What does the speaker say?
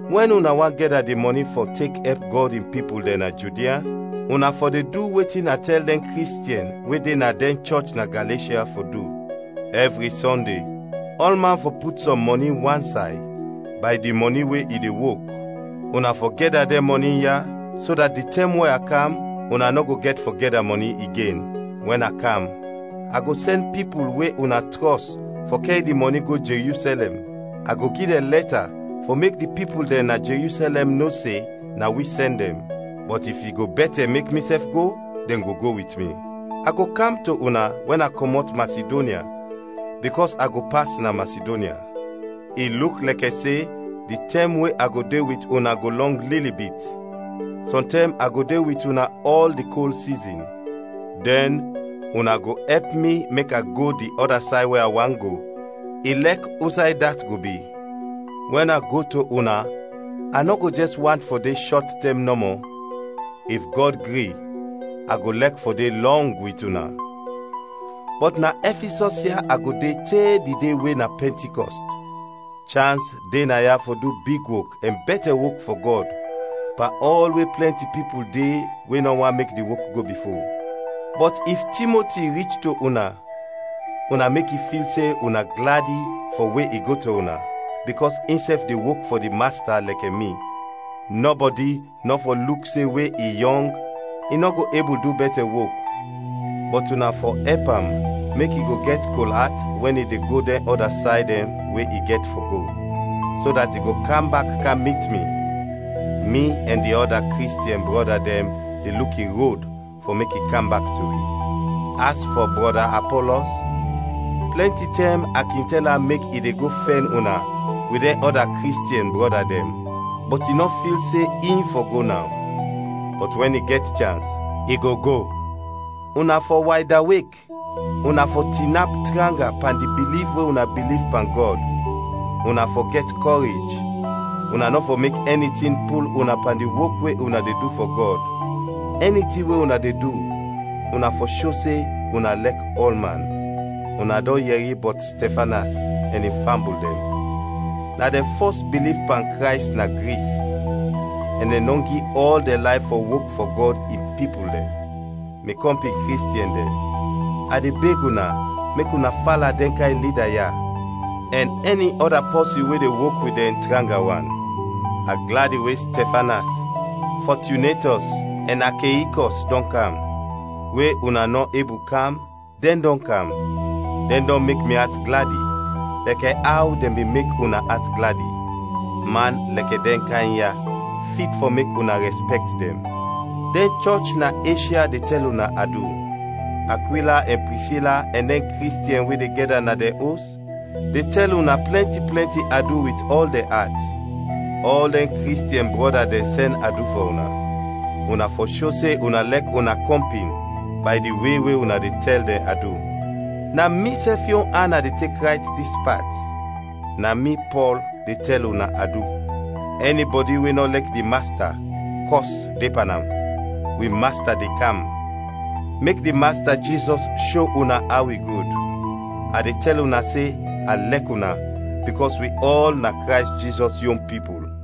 Wɛn una want gɛda di mɔni fɔ tek ɛp Gɔd in pipul dɛn na Judia; una fɔ de du wetin a tɛl dɛn Kristiɛn we de na dɛn chɔch na Galeshya fɔ du. Ɛvri Sɔnde, ɔlman fɔ put sɔm mɔni wansay, bay di mɔni we i de wok; una fɔ gɛda dɛn mɔni ya, so dat di tɛm we a kam, una nɔ go gɛt fɔ gɛda mɔni igen. Wɛn a kam, a go sɛn pipul we una trɔs fɔ kɛr di mɔni go Jerusɛlɛm, a go gi dɛn lɛta fɔ mek di pipul dɛn na Jerusɛlɛm no se na wi sɛn dɛn. Bɔt if i go bɛtɛ mek misɛf go, dɛn go go wit mi. A go kam to una wɛn a kɔmɔt Masidonya, bikɔs a go pas na Masidonya. I luk lɛkɛ se di tɛm we a go de wit una go lɔng lili bit, sɔntɛm a go de wit una ɔl di kol sizin; dɛn una go ɛp mi mek a go di ɔda say we a want go, ilɛk usay dat go bi. Wɛn a go to una a nɔ go jɛs want fɔ de shɔt tɛm nɔmɔ. If Gɔd gri, a go lɛk fɔ de lɔng wit una. Bɔt na Ɛfisɔs ya a go de te di de we na Pɛntikɔst. Chans de naya fɔ du big wok ɛn bɛtɛ wok fɔ Gɔd, pan ɔl we plɛnti pipul de we nɔ want mek di wok go bifo. Bɔt if Timoti rich to una, una mek i fil se una gladi fɔ we i go to una, bikɔs insɛf de wok fɔ di Masta lɛkɛ mi. Nɔbɔdi nɔ fɔ luk se we i yɔng, i nɔ go ebul du bɛtɛ wok, bɔt una fɔ ɛp am mek i go gɛt kol at wɛn i de go dɛn ɔda say dɛn we i gɛt fɔ go, so dat i go kam bak kam mit mi; mi ɛn di ɔda Kristiɛn brɔda dɛn de luk in rod fɔ mek i kam bak to wi. As fɔ brɔda Apɔlɔs, plɛnti tɛm a kin tɛl am mek i de go fɛn una wit dɛn ɔda Kristiɛn brɔda dɛn, bɔt i nɔ fil se in fɔ go naw. Bɔt wɛn i gɛt chans, i go go. Una fɔ waydawek, una fɔ tinap tranga pan di biliv we una biliv pan Gɔd, una fɔ gɛt kɔrej, una nɔ fɔ mek ɛni tin pul una pan di wok we una de du fɔ Gɔd. Ɛni tin we una de du, una fɔ sho se una lɛk ɔlman. Una dɔn yɛri bɔt Stɛfanas ɛn in fambul dɛn; na dɛn fɔs biliv pan Krays na Gris, ɛn dɛn dɔn gi ɔl dɛn layf fɔ wok fɔ Gɔd in pipul dɛn. Mi kɔmpin Kristiɛn dɛn, a de beg una mek una fala dɛn kayn lida ya, ɛn ɛni ɔda pɔsin we de wok wit dɛn tranga wan. A gladi we Stɛfanas, Fɔtunetɔs, ɛn Akeikɔs dɔn kam; we una nɔ ebul kam, dɛn dɔn kam, dɛn dɔn mek mi at gladi, lɛkɛ aw dɛn bin mek una at gladi. Man lɛkɛ dɛn kayn ya fit fɔ mek una rɛspɛkt dɛn. Dɛn chɔch na Eshya de tɛl una adu; Akwila ɛn Prisila ɛn dɛn Kristiɛn we de gɛda na dɛn os, de tɛl una plɛnti plɛnti adu wit ɔl dɛn at. Ɔl dɛn Kristiɛn brɔda dɛn sɛn adu fɔ una. Una fɔ sho se una lɛk una kɔmpin bay di we we una de tɛl dɛn adu. Na misɛf yon an a tek rayt dis pat: Na mi, Pɔl, de tɛl una adu. Ɛnibɔdi we nɔ lɛk di Masta, kɔs de pan am. Wi Masta de kam! Mek di Masta Jizɔs sho una aw i gud. A de tɛl una se a lɛk una bikɔs wi ɔl na Krays Jizɔs yon pipul.